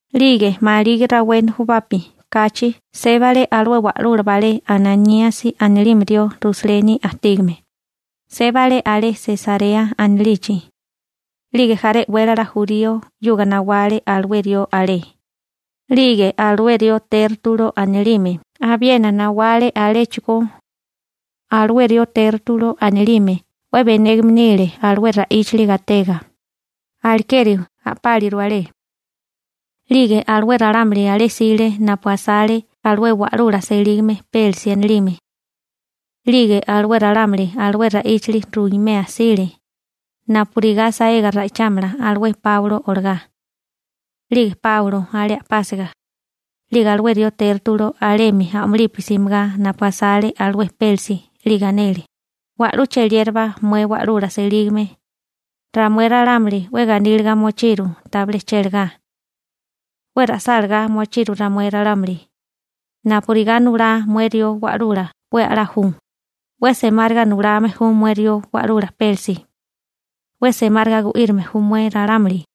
'Lige maligi rawé nujubapi kachi sébale alué wa'lula balé Ananíasi anilime rió Rusaleni ajtígame, sébale alé Sesarea anilichi. 'Lige jaré e'wélala jurío 'yuga nawale alué rió alé. 'Lige alué rió Tértulo anilime abiena nawale aléchigó. Alué rió Tértulo anilime 'we benégame nile alué ra'íchili gatega, alekeri a'páliru alé. 'Lige alué ralámuli alé jsile napu asale alué wa'lula selígame Pélisi anilime. 'Lige alué ralámuli alué ra'íchili ruimea jsile, napurigá saega ra'ichámala alué Páulo olagá. 'Lige Páulo alé a'pásiga, 'lige alué rió Tértulo alemi a'mulipi simigá napu asale alué Pélisi 'lige anele: ―Wa'lú cheliérabá mué wa'lula selígame, ramué ralámuli 'we ganíliga mochiru tabilé chélagá. 'We ra'sálagá mochiru ramué ralámuli, napurigá nulá mué rió wa'lula 'we a'lá ju, 'we semáriga nulame ju mué rió wa'lula Pélisi. 'We semáriga gu'írime ju mué ralámuli.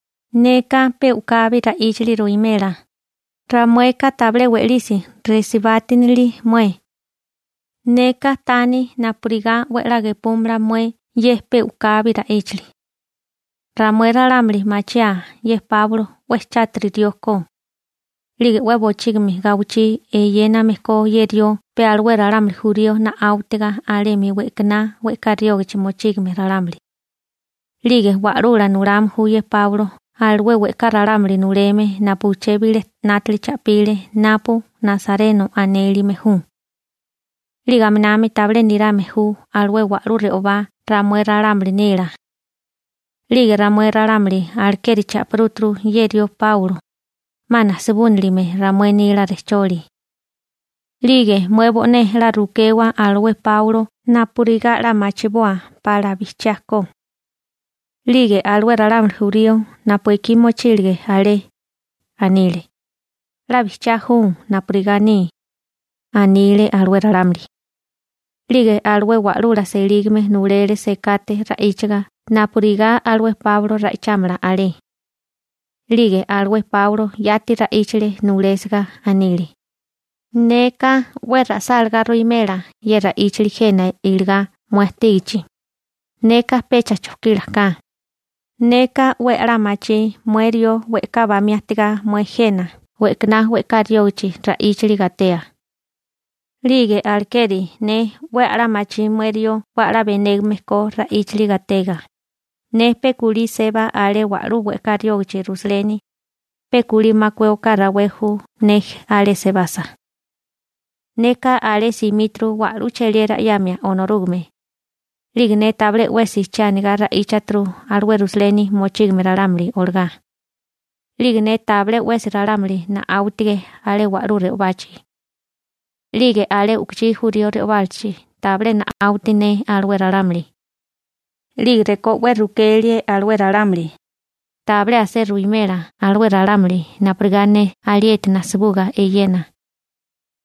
Neka pe u'kabi ra'íchali ruwimela, ramueka tabilé we'lisi resibátinile mué. Neka taní napurigá 'we 'la gepúmala mué ye pe u'kabi ra'íchali. Ramué ralámuli machiaa ye Páulo 'we chátiri rió ko. 'Lige 'we bochígimi gawichí eyéname ko ye rió pe alué ralámuli jurío na'áwitiga alemi we'kaná we'ká riógichi mochígame ralámuli. 'Lige wa'lula nulame ju ye Páulo alué we'ká ralámuli nuleme napu uché bilé 'nátili cha'pile napu Nasareno anélime ju. 'Lige aminami tabilé nirame ju alué wa'lú re'obá ramué ralámuli nila. 'Lige ramué ralámuli alekeri cha'pirúturu ye rió Páulo, 'ma najsibúnilime ramué nila rejcholi. 'Lige mué bo'né 'la rukewa alué Páulo napurigá 'la machiboa pala 'la bijchiá ko. 'Lige alué ralámuli jurío napu ekí mochílige alé, anile: ―'La bijchiá ju napurigá aní ―anile alué ralámuli. 'Lige alué wa'lula selígame nulele sekate ra'íchaga napurigá alué Páulo ra'ichámala alé. 'Lige alué Páulo yati ra'íchale nulésiga. Anile: ―Neka 'we ra'sálagá ruwimela ye ra'íchili jena iligá mué ajtígichi, neka pecha chokílaká. Neka 'we a'lá machí mué rió we'ká bamí ajtigá mué jena we'kaná we'ká riógichi ra'íchali gatea. 'Lige alekeri ne 'we a'lá machí mué rió 'we a'lá benégame ko ra'íchali gatega. Ne pe kulí seba alé wa'lú we'ká riógichi Rusaleni, pe kulí makué oká rawé ju ne alé sebasa. Neka alé simíturu wa'lú cheliera 'yamia Onorúgame. 'Lige ne tabilé 'wesi che anigá ra'íchaturu alué Rusaleni mochígame ralámuli olagá. 'Lige ne tabilé 'wesi ralámuli na'áwitige alé wa'lú re'obachi. 'Lige alé u'kuchí jurío re'obálachi tabilé na'áwiti ne alué ralámuli. 'Lige rekó 'we rukelie alué ralámuli, tabilé asé ruwimela alué ralámuli napurigá ne alieti najsibuga eyena.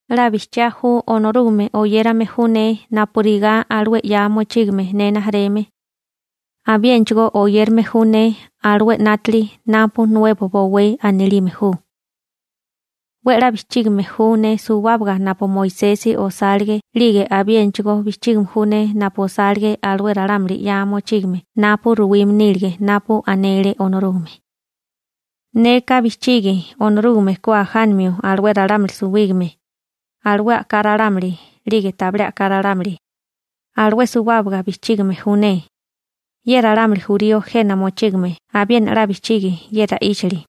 'La bijchiá ju Onorúgame oyérame ju ne napurigá alué 'ya mochígame ne rijimala. Abiénachigó oyérame ju ne alué 'nátili napu Nuebo Bowé anilime ju. 'We 'la bijchígame ju ne suwábaga napu Moisesi osálige 'lige abiénachigó bijchígame ju ne napu osálige alué ralámuli 'ya mochígame napu ruwime nílige napu anele Onorúgame. Neka bijchigi Onorúgame ku ajánimio alué ralámuli suwígame, alué a'ká ralámuli 'lige tabilé a'ká ralámuli. Alué suwábaga bijchígime ju ne. Ye ralámuli jurío jena mochígame abiena 'la bijchigi ye ra'íchali.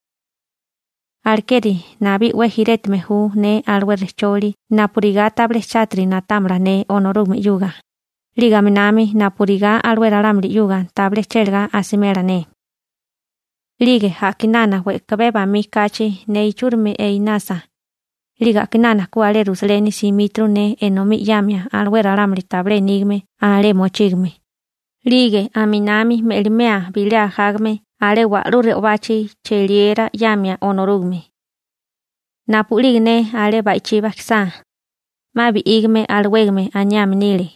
Alekeri nabí 'we jirétime ju ne alué rejcholi napurigá tabilé chátiri na'támala ne Onorúgame 'yuga, 'lige aminami napurigá alué ralámuli 'yuga tabilé chélagá asimela ne. › 'Lige a'kinana we'kabé bamí kachi ne ichúrimi einasa, 'lige a'kinana ku alé Rusaleni simíturu ne enomí 'yamia alué ralámuli tabilé nígame alé mochígame, 'lige aminami me'limea bilé ajágame alé wa'lú re'obachi cheliera 'yamia Onorúgame. Napu'lige ne alé ba'ichí bajkisá, 'ma bi'ígame alawégame aniame nile,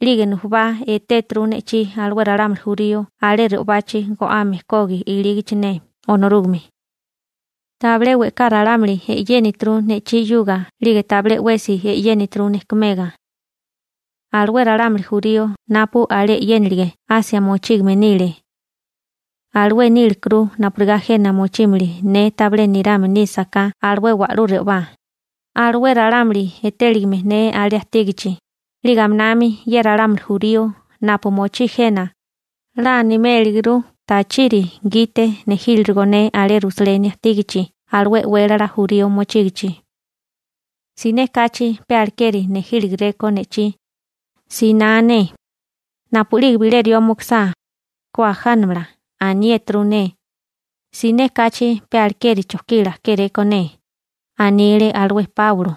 'lige nujubá etéturu ne'chí alué ralámuli jurío alé re'obachi go'ame kogi ilígichi ne Onorúgame. Tabilé we'ká ralámuli e'yénituru ne'chí 'yuga 'lige tabilé 'wesi e'yénituru nejkumega. Alué ralámuli jurío napu alé e'yénilige Asia mochígame nile. Alué níligekuru napurigá jena mochímili ne tabilé nirame nísaká alué wa'lú re'obá, alué ralámuli etéligame ne alé ajtígachi. 'Lige aminami ye ralámuli jurío napu mochí jena, 'la animéliguru tachiri gite nejíriligo ne alé Rusaleni ajtígachi alué e'wélala jurío mochígichi. Siné kachi pe alekeri nejíligeréko ne'chí, siná ne: «Napu'lige bilé rió mukusá, ku ajánamala», aniéturu ne. Siné kachi pe alekeri chojkila kéréko ne ―anile alué Páulo.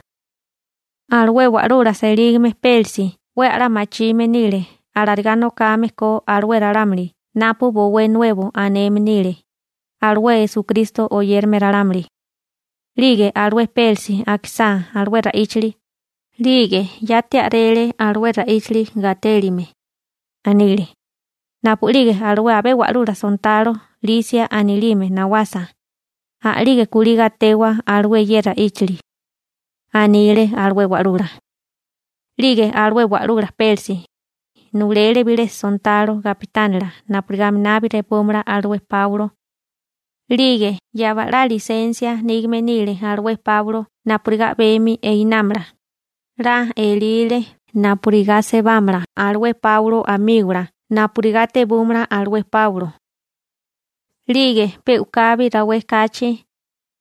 Alué wa'lula selígame Pélisi 'we a'lá machime nile alarigá nokame ko alué ralámuli napu Bowé Nuebo aneme nile, alué Esukristo oyérame ralámuli. 'Lige alué Pélisi akisá alué ra'íchali, 'lige yati a'rele alué ra'íchili gatélime. Anile: ―Napu'lige alué abé wa'lula sontalo Lisia anilime nawasa, a'lige kulí gatewa alué ye ra'íchili ―anile alué wa'lula. 'Lige alué wa'lula Pélisi, nulele bilé sontalo gapitánila napurigá aminabi repúmala alué Páulo. 'Lige yaba'lá lisensia nígame nile alué Páulo napurigá a'bemi einámala. 'La elile napurigá sebámala alué Páulo amígola napurigá tebúmala alué Páulo. 'Lige pe u'kabi rawé kachi,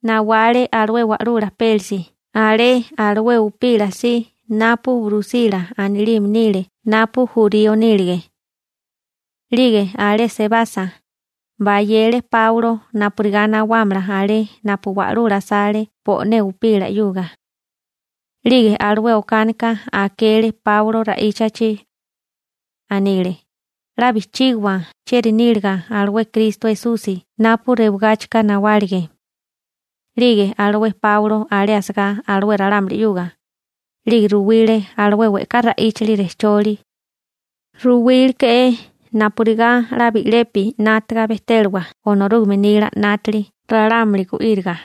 nawale alué wa'lula Pélisi alé alué upila si napu Brusila anilime nile napu jurío nílige. 'Lige alé sebasa, bayele Páulo napurigá nawámala alé napu wa'lula asale bo'né upila 'yuga. 'Lige alué okánika akele Páulo ra'íchachi. Anile: ―'La bijchígiwa chieri níliga alué Kristo Esusi napu rewagáchika nawálige. 'Lige alué Páulo alé asagá alué ralámuli 'yuga, 'lige ruwile alué we'ká ra'íchili rejcholi. Ruwíleke'é napurigá 'la bi'lepi 'nátaga bejtélawa Onorúgame nila 'nátili ralámuli gu'íriga.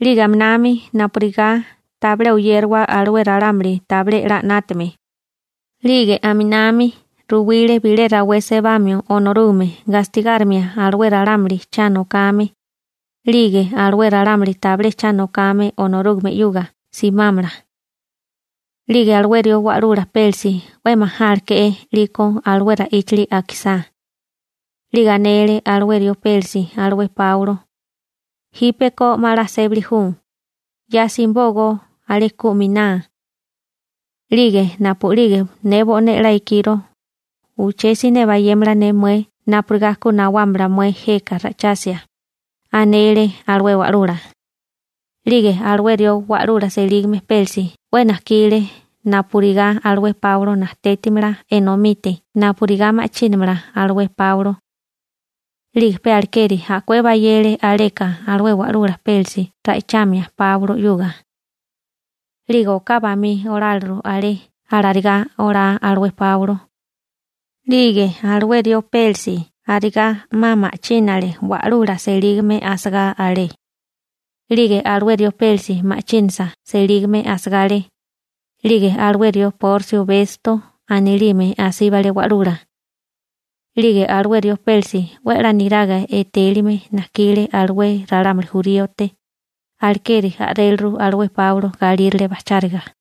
'Lige aminami napurigá tabilé oyérawa alué ralámuli tabilé 'la 'nátame. 'Lige aminami ruwile bilé rawé sebamio Onorúgame gastigárimia alué ralámuli cha nokame, 'lige alué ralámuli tabilé cha nokame Onorúgame 'yuga simámala. 'Lige alué rió wa'lula Pélisi 'we majáleke'é 'liko alué ra'íchili akisá. 'Lige anele alué rió Pélisi alué Páulo: ―Jípeko 'ma 'la sébali ju, ya simibógó alé ku miná. 'Lige napu'lige ne bo'né 'la ikiro, uché siné bayémala ne mué napurigá ku nawámala mué jeka ra'ichasia ―anele alué wa'lula. 'Lige alué rió wa'lula selígame Pélisi 'we najkile napurigá alué Páulo najtétimala enomite napurigá ma'chínamala alué Páulo. 'Lige pe alekeri a'kué bayele aleka alué wa'lula Pélisi ra'ichamia Páulo 'yuga. 'Lige oká bamí oláliru alé alarigá olá alué Páulo. 'Lige alué rió Pélisi arigá 'ma ma'chínale wa'lula selígame asagá alé. 'Lige alué rió Pélisi ma'chínasa selígame asagá alé, 'lige alué rió Porsio Besto anilime asíbale wa'lula. 'Lige alué rió Pélisi 'we a'lá niraga etélime najkile alué ralámuli juríote, alekeri a'réliru alué Páulo galírale bajcháriga.